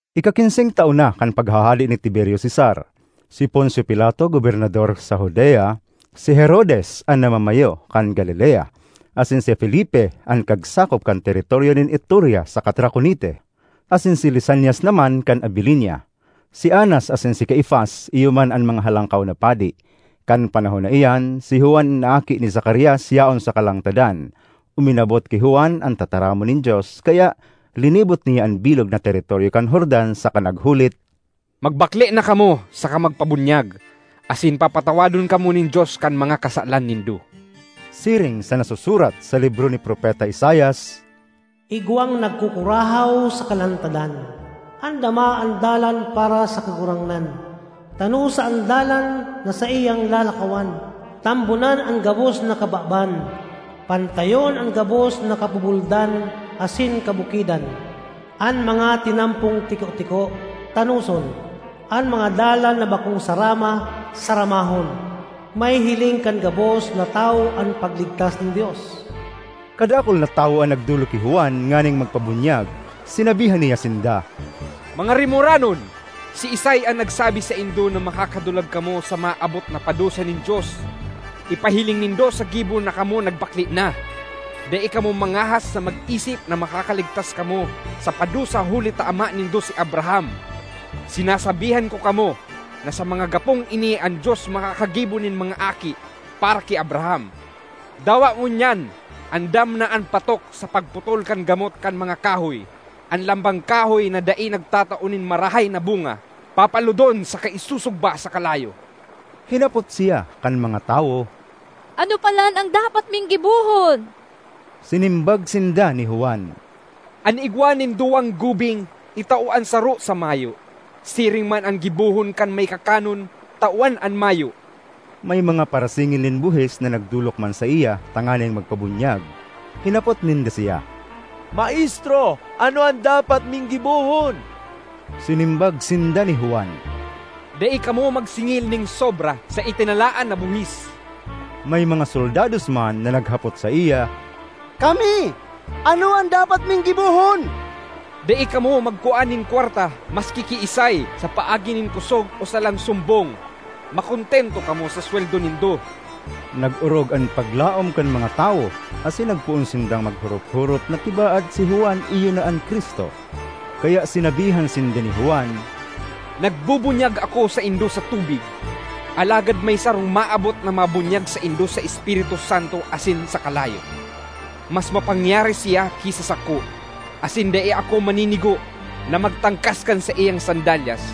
Ikakinseng taon na kan paghahade ni Tiberio Cesar; si Poncio Pilato gobernador sa Judea, si Herodes an namamayo kan Galilea asin si Felipe an kagsakop kan teritoryo nin Iturea saka Traconite, asin si Lisanias naman kan Abilinia. Si Anas asin si Caifas iyo man an mga halangkaw na padi. Kan panahon na iyan, si Juan na aki ni Zacarias yaon sa kalangtadan. Uminabot ki Juan an tataramon nin Dios, kaya linibot niya an bilog na teritoryo kan Jordan saka naghulit, “Magbakle na kamo saka magpabunyag, asin papatawadon kamo nin Dios kan mga kasalan nindo.” Siring sa nasusurat sa libro ni Propeta Isaias, “Igwang nagkukurahaw sa kalangtadan: ‘Andama an dalan para sa Kagurangnan; tanosa an dalan na saiyang lalakawan! Tambonan an gabos na kababan, pantayon an gabos na kabubuldan asin kabukidan. An mga tinampong tiko-tiko, tanoson; an mga dalan na bakong sarama, saramahon. Mahihiling kan gabos na tawo an pagligtas nin Dios!’” Kadakul na tawo an nagdolok ki Juan nganing magpabunyag. Sinabihan niya sinda, “Mga rimoranon! Siisay an nagsabi saindo na makakadulag kamo sa maabot na padusa nin Dios? Ipahiling nindo sa gibo na kamo nagbakle na. Dai kamo mangahas na mag-isip na makakaligtas kamo sa padusa huli ta ama nindo si Abraham. Sinasabihan ko kamo, na sa mga gapong ini an Dios makakagibo nin mga aki para ki Abraham. Dawa ngunyan andam na an patok sa pagputol kan gamot kan mga kahoy; an lambang kahoy na dai nagtatao nin marahay na bunga, papalodon saka isusugba sa kalayo.” Hinapot siya kan mga tawo, “Ano palan an dapat ming gibohon?” Sinimbag sinda ni Juan, “An igwa nin duwang gubing, itao an saro sa mayo; siring man an gibohon kan may kakanon, tawan an mayo.” May mga parasingil nin buhis na nagdolok man saiya tanganing magpabunyag. Hinapot ninda siya, “Maestro ano an dapat ming gibohon?” Sinimbag sinda ni Juan, “Dai kamo magsingil nin sobra sa itinalaan na buhis.” May mga soldados man na naghapot saiya, “Kami, ano an dapat ming gibohon?” “Dai kamo magkua nin kwarta maski kiisay sa paagi nin kosog o salang sumbong; makontento kamo sa sweldo nindo.” Nag-orog an paglaom kan mga tawo asin nagpoon sindang maghorop-horop na tibaad si Juan iyo na an Cristo. Kaya sinabihan sinda ni Juan, “Nagbubunyag ako saindo sa tubig, alagad may sarong maabot na mabunyag saindo sa Espiritu Santo asin sa kalayo. Mas mapangyari siya ki sa sako, asin dai ako maninigo na magtangkas kan saiyang sandalyas.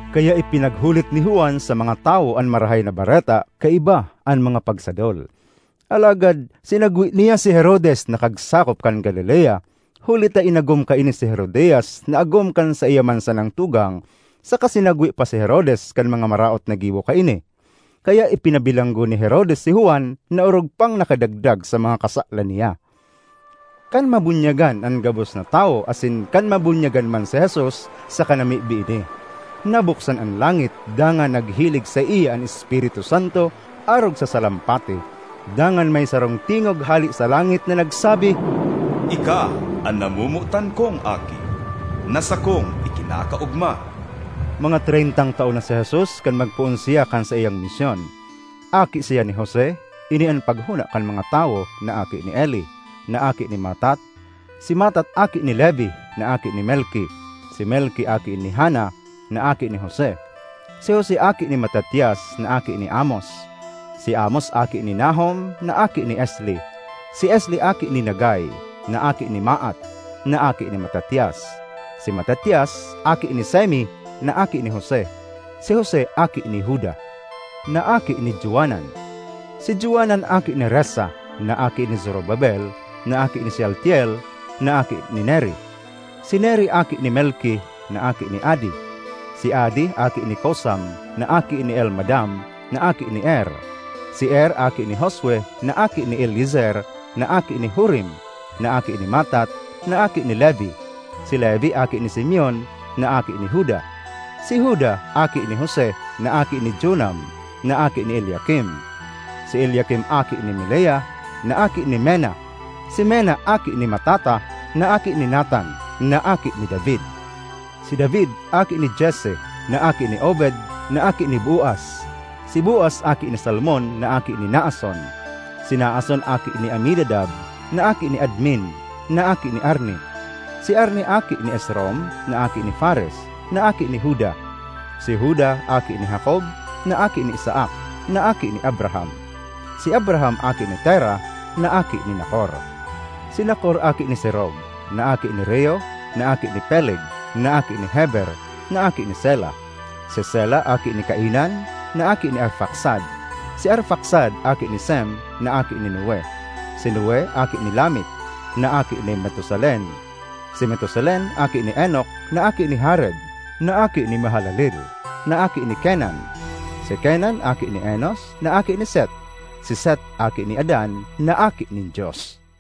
Kaya ipinaghulit ni Juan sa mga tawo an Marahay na Bareta kaiba an mga pagsadol. Alagad sinagwe niya si Herodes na kagsakop kan Galilea, huli ta inagom kaini si Herodias na agom kan saiya man sanang tugang, saka sinagwe pa si Herodes kan mga maraot na gibo kaini. Kaya ipinabilanggo ni Herodes si Juan, na orog pang nakadagdag sa mga kasalan niya. Kan mabunyagan an gabos na tawo asin kan mabunyagan man si Jesus saka namimibi ini, nabuksan an langit dangan naghilig saiya an Espiritu Santo arog sa salampati. Dangan may sarong tingog hale sa langit na nagsabi, “Ika an namomotan kong Aki na sakong ikinakaogma.” Mga treyntang taon na si Jesus kan magpoon siya kan saiyang misyon. Aki siya ni Jose (ini an paghona kan mga tawo) na aki ni Eli, na aki ni Matat. Si Matat aki ni Levi, na aki ni Melki; si Melki aki ni Jana, na aki ni Jose. Si Jose aki ni Matatias, na aki ni Amos. Si Amos aki ni Nahum, na aki ni Esli. Si Esli aki ni Nagai, na aki ni Maat, na aki ni Matatias. Si Matatias aki ni Semei, na aki ni Jose. Si Jose aki ni Juda, na aki ni Joanan. Si Joanan aki ni Resa, na aki ni Zorobabel na aki ni Sealtiel, na aki ni Neri. Si Neri aki ni Melki, na aki ni Adi. Si Adi aki ni Cosam, na aki ni Elmadam, na aki ni Er. Si Er aki ni Josue, na aki ni Eliezer, na aki ni Jorim, na aki ni Matat, na aki ni Levi. Si Levi aki ni Simeon, na aki ni Juda. Si Juda aki ni Jose, na aki ni Jonam, na aki ni Eliakim. Si Eliakim aki ni Melea, na aki ni Menna. Si Menna aki ni Matata, na aki ni Natan, na aki ni David. Si David aki ni Jesse, na aki ni Obed, na aki ni Boaz. Si Boaz aki ni Salmon, na aki ni Naason. Si Naason aki ni Aminadab, na aki ni Admin, na aki ni Arni; si Arni aki ni Esrom, na aki ni Fares, na aki ni Juda. Si Juda aki ni Jacob, na aki ni Isaac, na aki ni Abraham. Si Abraham aki ni Tera, na aki ni Nacor. Si Nacor aki ni Serug, na aki ni Reu, na aki ni Peleg, na aki ni Heber, na aki ni Sela. Si Sela aki ni Cainan, na aki ni Arfaxad. Si Arfaxad aki ni Sem, na aki ni Noe. Si Noe aki ni Lamec, na aki ni Metusalen. Si Metusalen aki ni Enoc na aki ni Jared, na aki ni Mahalaleel, na aki ni Kenan. Si Kenan aki ni Enos, na aki ni Set. Si Set aki ni Adan, na aki nin Dios.